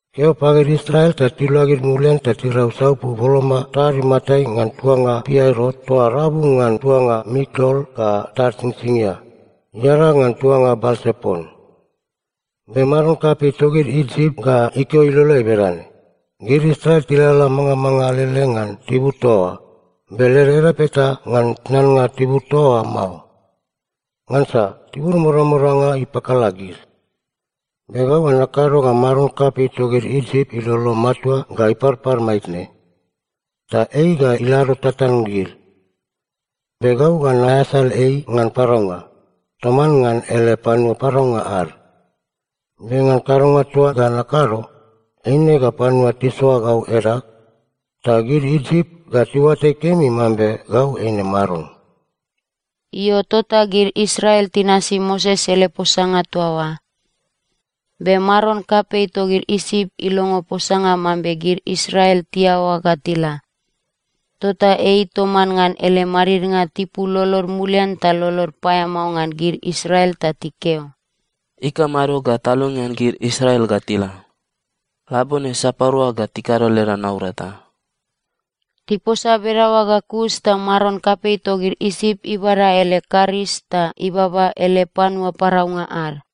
“Keo pagid Israel ta tiluagid mulian ta tirau saupu boloma tad matai ngan tuanga Piairot toa rabu ngan tuanga Mikdol ga tad Singsingia, iadag ngan tuanga Balsepon. Be maron kapei togid Isip ga ikeo iloleai bedane, ‘Gid Israel tilalala mangamanga alele ngan tibur toa oa, be led edap eta ngan tnannga tibur toa oa mao, ngansa tibur modamodanga ipakala gid.’ Be gau ga nakado ga maron kapei togid Isip ilolo matua ga iparpar maitne, ta ei ga ilado tatan gid. Be gau ga naeasal ei ngan paraunga, toman ngan ele panua paraunga ad. Be ngan kadonga toa ga nakado, eine ga panua tisoa gau edag. Ta gid Isip ga tiuatai kemi mambe gau eine Maron.” Io, tota gid Israel tinasi Moses ele posanga toa oa. Be maron kapei togid Isip ilongo posanga mambe gid Israel tiaoa ga tila, tota ei toman ngan ele madidnga tipul lolod mulian ta lolod paeamao ngan gid Israel ta tikeo, “Ikamado ga talongean gid Israel ga tila? Labone sapadua ga tikado leda naurata?” Tiposa bedaoa ga kus ta maron kapei togid Isip ibada ele karis ta ibaba ele panua paraunga ad.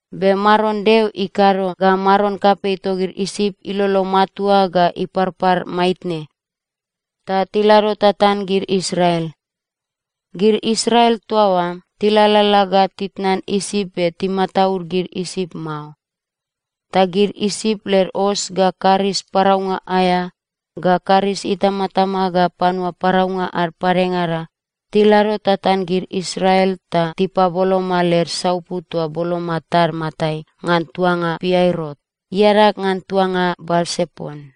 Be Maron Deo ikado ga maron kapei togid Isip ilolo matua ga iparpar maitne, ta tilado tatan gid Israel. Gid Israel toa oa tilalala ga titnan Isip be timataud gid Isip mao. Ta gid Isip led os ga karis paraunga aea ga karis itamatama ga panua paraunga ad padengada tilado tatan gid Israel ta tipaboloma led saupu toa boloma tad matai ngan tuanga Piairot, iadag ngan tuanga Balsepon.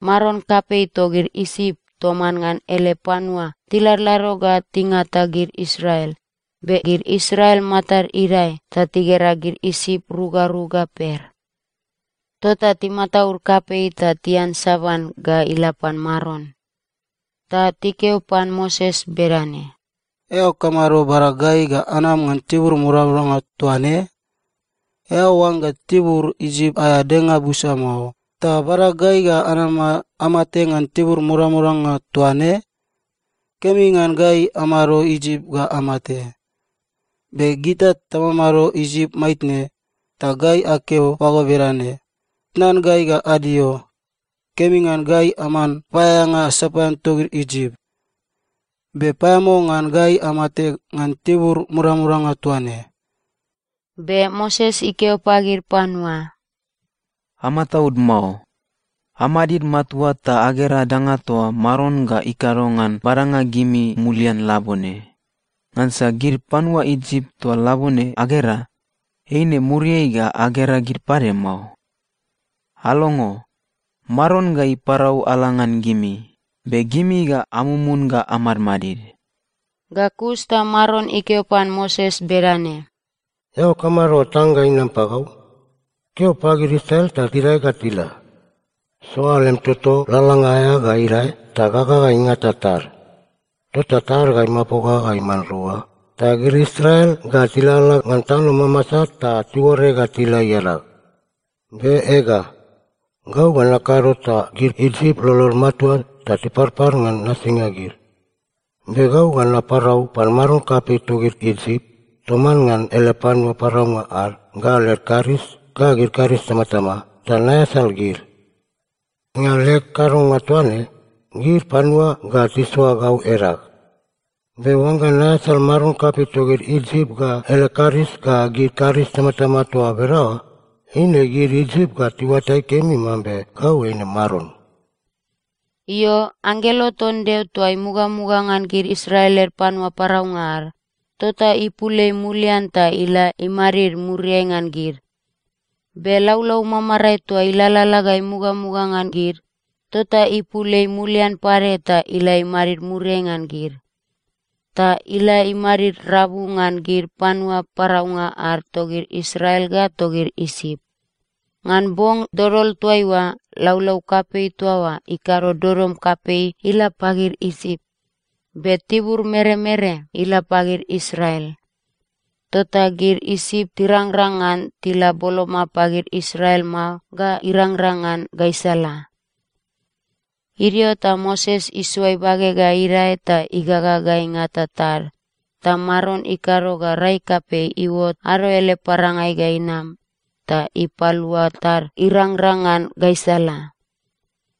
Maron kapei togid Isip toman ngan ele panua tiladlado ga tingata gid Israel, be gid Israel matad idae, ta tigera gid Isip ru ga ru ga per. Tota timataud kapei ta tiansaban ga ila pan Maron. Ta tikeo pan Moses bedane, “Eao kamado bada gai ga anam ngan tibur modamodanga toa ne? Eao oangga tibur Isip aea denga busa mao, ta bada gai ga anama amate ngan tibur modamodanga toa ne? Kemi ngan gai amado Isip ga amate. Be gita tamamado Isip maitne, ta gai akeo pago bedane, ‘Tnan gai ga adio. Kemi ngan gai aman paeaeanga sapaean togid Isip.’ Be paeamao ngan gai amate ngan tibur modamodanga toa ne.” Be Moses ikeo pagid panua, “Amataud mao. Amadid matua ta agera danga toa Maron ga ikado ngan badanga gimi mulian labone. Ngansa gid panua Isip toa labone agera, eine muriai ga agera gid pade mao. Alongo. Maron ga iparau ala ngan gimi. Be gimi ga amumun ga amadmadid.” Ga kus ta Maron ikeo pan Moses bedane, “Eao kamado tang ga inam pagau? Keo pagid Israel ta tidae ga tila. Soa lem toto lalalanga aea ga idae ta gaga ga ingata tad. Tota tad ga imapoga ga iman rua, ta gid Israel ga tilalala ngan tano mamasa ta tiuore ga tila iadag. Be ega, gau ga nakado ta gid Isip lolod matua ta tiparpar ngan nasinga gid. Be gau ga naparau pan maron kapei togid Isip toman ngan ele panua paraunga ad ga led karis ga gid karis itamatama, ta naeasal gid. Ngan leg kadonga toa ne, gid panua ga tisoa gau edag. Be oangga naeasal maron kapei togid Isip ga ele karis ga gid karis itamatama toa bedaoa, eine gid Isip ga tiuatai kemi mambe gau eine Maron.” Io, anggelo ton Deo toa imugamuga ngan gid Israel led panua paraunga ad, tota ipul ei mulian ta ila imadid muriai ngan gid. Be laulau mamarae toa ilalala ga imugamuga ngan gid, tota ipul ei mulian pade ta ila imadid muriai ngan gid. Ta ila imadid rabu ngan gid panua paraunga ad togid Israel ga togid Isip. Ngan bong dodol toaiua laulau kapei toa oa ikado dodom kapei ila pagid Isip, be tibur meremere ila pagid Israel. Tota gid Isip tirangrang ngan tila boloma pagid Israel mao ga irangrang ngan gaisala. Idio ta Moses isoa ibage ga idae ta igaga ga ingata tad, ta Maron ikado ga rai kapei iuot ado ele parangai ga inam ta ipalua tad irangrang ngan gaisala.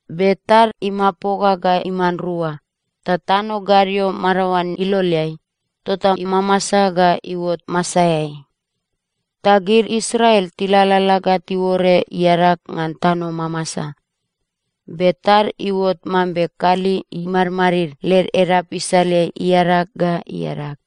Be tad imapoga ga iman rua, ta tano gadio madaoan iloleai, tota imamasa ga iuot masaeai. Ta gid Israel tilalala ga tiuore iadag ngan tano mamasa. Be tad iuot mambe kali imadmadid led edap isaleai iadag ga iadag.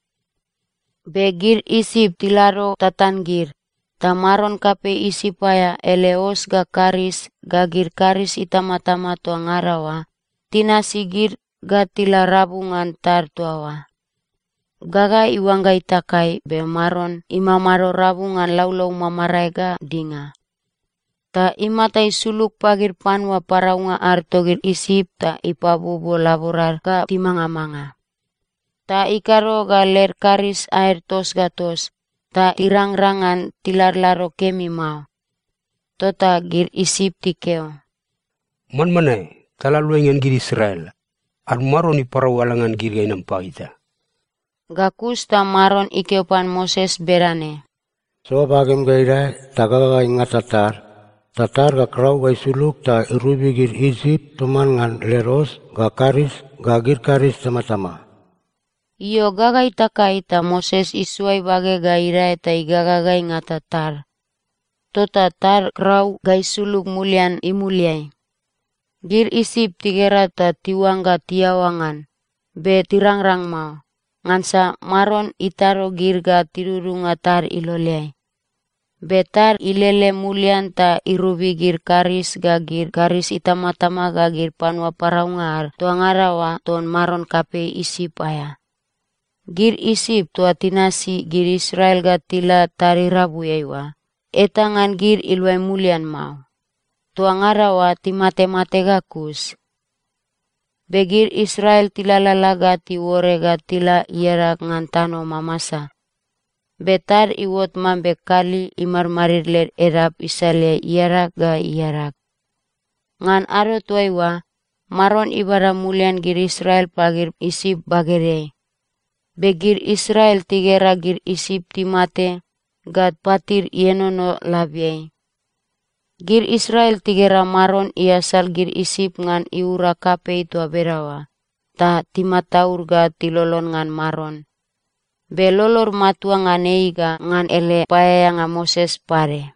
Be gid Isip tilado tatan gid, ta maron kapei Isip aea ele os ga karis ga gid karis itamatama toa ngada oa tinasi gid ga tila rabu ngan tad toa oa. Gaga iuangga itakai, be Maron imamado rabu ngan laulau mamarae ga dinga, ta imata isulug pagid panua paraunga ad togid Isip ta ipabuobuo laborad ga timangamanga. Ta ikado ga led karis aed tos ga tos, ta tirangrang ngan tiladlado kemi mao. Tota gid Isip tikeo, “Manmanae! Tala aluai ngan gid Israel. Ad Maron iparau ala ngan gid ga inam pagita.” Ga kus ta Maron ikeo pan Moses bedane, “Soa bagem ga idae ta gaga ga ingata tad, ta tad ga krau ga isulug ta irobi gid Isip toman ngan led os ga karis ga gid karis itamatama.” Io, gaga itakai ta Moses isoa ibage ga idae ta igaga ga ingata tad. Tota tad krau ga isulug mulian imuliai. Gid Isip tigera ta tiuangga tiaoa ngan, be tirangrang mao, ngansa Maron itado gid ga tidudunga tad iloleai. Be tad ilele mulian ta irobi gid karis ga gid karis itamatama ga gid panua paraunga ad toa ngada oa ton maron kapei Isip aea. Gid Isip toa tinasi gid Israel ga tila tad irabuiai oa, eta ngan gid iluai mulian mao. Toa ngada oa timatemate ga kus. Be gid Israel tilalala ga tiuore ga tila iadag ngan tano mamasa. Be tad iuot mambe kali imadmadid led edap isaleai iadag ga iadag. Ngan ado toaiua, Maron ibada mulian gid Israel pagid Isip bagedeai. Be gid Israel tigera gid Isip timate ga patid ienono labiai. Gid Israel tigera Maron iasal gid Isip ngan iura kapei toa bedaoa, ta timataud ga tilolon ngan Maron, be lolod matua ngan ei ga ngan ele paeaeanga Moses pade.